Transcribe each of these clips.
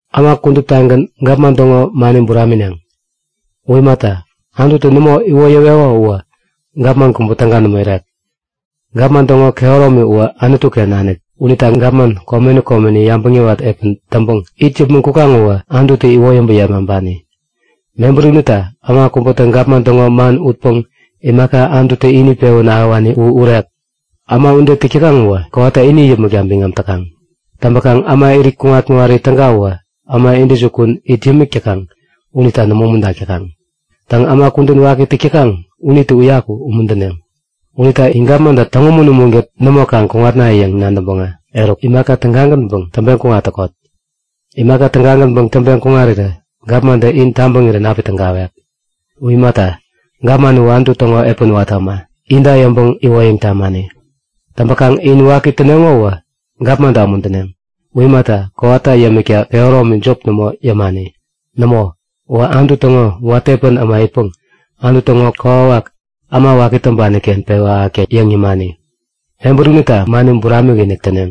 Äma kuduptagän gapman täŋo mani buramineŋ. U imata, Anututä nämo iwoyäweko uwä gapman kubä täga nämo irek. Gapman täŋo kehäromi uwä Anutu-ken nanik unita gapman komeni komeni yabäŋ yäwat epän täŋpäŋ it yäpmäŋ kukaŋ uwä Anututä iwoyäŋpäŋ yepmaŋpani. Mebäri unita äma kubätä gapman täŋo man utpäŋ imaka Anututä ini pewän ahäwani u urek. Äma ude täk täkaŋ uwä kowata ini yäpmäkta biŋam täkaŋ. Täŋpäkaŋ äma irit kuŋat-kuŋari täga uwä äma intäjukun it yämik täkaŋ unita nämo umuntak täkaŋ. Täŋ, äma kudän waki täk täkaŋ unitä uyaku umuntäneŋ. Unita in gapmanta täŋumun-umunkät nämo kaŋ kuŋatnayäŋ nadäŋpäŋä eruk imaka tägagänpäŋ täŋpeŋ kuŋat täkot. Imaka tägagänpäŋ taŋpeŋ kuŋarirä gapmantä in tabäŋirän api tägawek. U imata, gapman uwä Anutu täŋo epän watä äma, inta yäŋpäŋ iwoyäŋ tamani. Täŋpäkaŋ in waki täneŋo uwä gapmanta umuntäneŋ. U imata, kowata yämikta kehäromi jop nämo yämani. Nämo, uwä Anutu täŋo watä epän äma itpäŋ Anutu täŋo kokwawak äma waki täŋpani-ken pewä ahäkta yäŋ yämani. Mebäri unita mani buramik-inik täneŋ.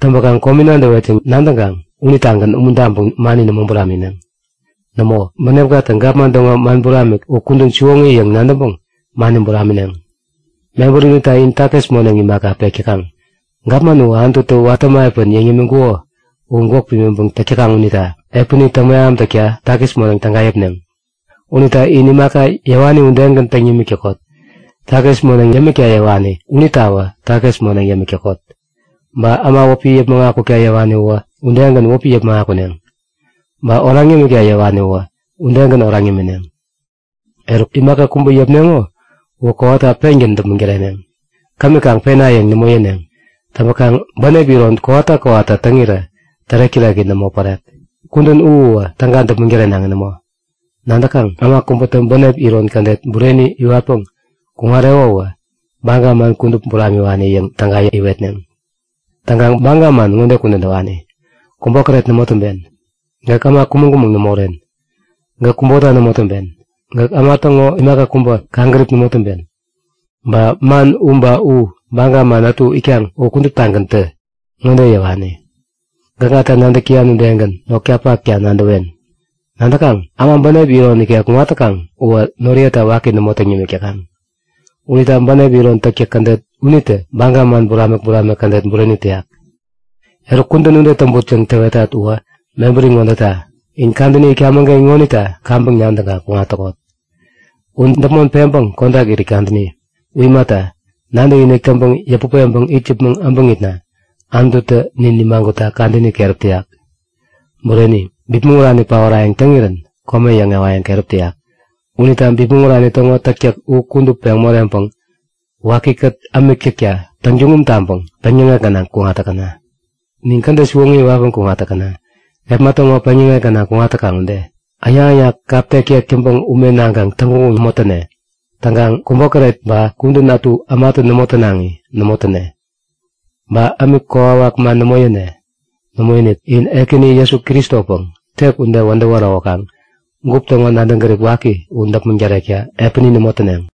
Täŋpäkaŋ komi nadäwet yäŋ nadäŋkaŋ unitagän umuntaŋpäŋ mani nämo buramineŋ. Nämo, bänepkatä gapman täŋo man buramik u kudän siwoŋi yäŋ nadäŋpäŋ mani buramineŋ. Mebäri unita in takis moneŋ imaka, pek täkaŋ. Gapman uwä Anututä watä äma epän yäŋ yämiŋkuko u gwäk pimiŋpäŋ täk täkaŋ unita epäni täŋmeham takta takis moneŋ täga yäpneŋ. Unita in imaka yäwani udegän täŋ yämik täkot. Takis moneŋ yämikta yäwani unitawä takis moneŋ yämik täkot. Ba äma wäpi yäpmäŋ akukta yäwani uwä udegän wäpi yäpmäŋ akuneŋ. Ba oraŋ yämikta yäwani uwä udegän oraŋ yämineŋ. Eruk, imaka kubä yäpneŋo uwä kowata pengän däpmäŋ täreneŋ, kämi kaŋ pena yäŋ nämo yäneŋ. Täŋpäkaŋ bänep iron kowata kowata täŋirä tärek-täreki nämo pärek. Kudän u uwä täga däpmäŋ tärenaŋi nämo. Nadäkaŋ? Äma kubätä bänep iron kädet bureni iwatpäŋ kuŋareko uwä baga man kudup buramiwani yäŋ täga iwetneŋ. Täŋkaŋ baga man ŋode kudän täwani; Kubokäret nämo täŋpen. Gäk äma kumäŋ-kumäŋ nämo uren. Gäk kubota nämo täŋpen. Gäk äma täŋo imaka kubä kaŋgärip nämo täŋpen. Baga man u ba baga man ätu itkaŋ u kuduptagäntä ŋode yäwani; Gäkŋata nadäk täyan udegän notkapakta nadäwen. Nadäkaŋ? Äma bänep iron ikek kuŋat täkaŋ uwä noriyeta waki nämo täŋ yämik täkaŋ. Unita bänep iron täktäk kädet unitä baga man buramik-buramik kädet bureni täyak. Eruk, kudän ude täŋput yäŋ täwetat uwä mebäri ŋodeta; In kadäni itkamäŋ-ken ŋonita kaŋpäŋ nadäŋkaŋ kuŋat täkot. U däpmon peŋpäŋ kodak irit kadäni. U imata, nadäkinik täŋpäŋ yäput peŋpäŋ it yäpmäŋ äbäŋitna Anututä nin nimagutta kadäni keräp täyak. Bureni! Bipmäŋ urani paorayäŋ täŋirän kome yäŋewayäŋ keräp täyak. Unita bipmäŋ urani täŋo täktäk u kudup peŋ moreŋpäŋ wakikät ämik täkta täŋtuŋum taŋpäŋ peŋyäŋek gänaŋ kuŋat täkäna. Nin kädet siwoŋi iwatpäŋ kuŋat täkäna, kepma täŋo peŋyäŋek gänaŋ kuŋat täkaŋ ude. Äŋnak-äŋnak kap tektek täŋpäŋ ume naŋkaŋ täŋguŋguŋ nämo täne. Täŋkaŋ kubokäret ba kudän ätu ämatä nämo tänaŋi nämo täne. Ba ämik kokwawak man nämo yäne. Nämoinik, in Ekäni Jesu Kristopäŋ tek ude wädäwä ärowäkaŋ gup täŋo nadäŋ gärip waki u däpmäŋ tärekta epäni nämo täneŋ.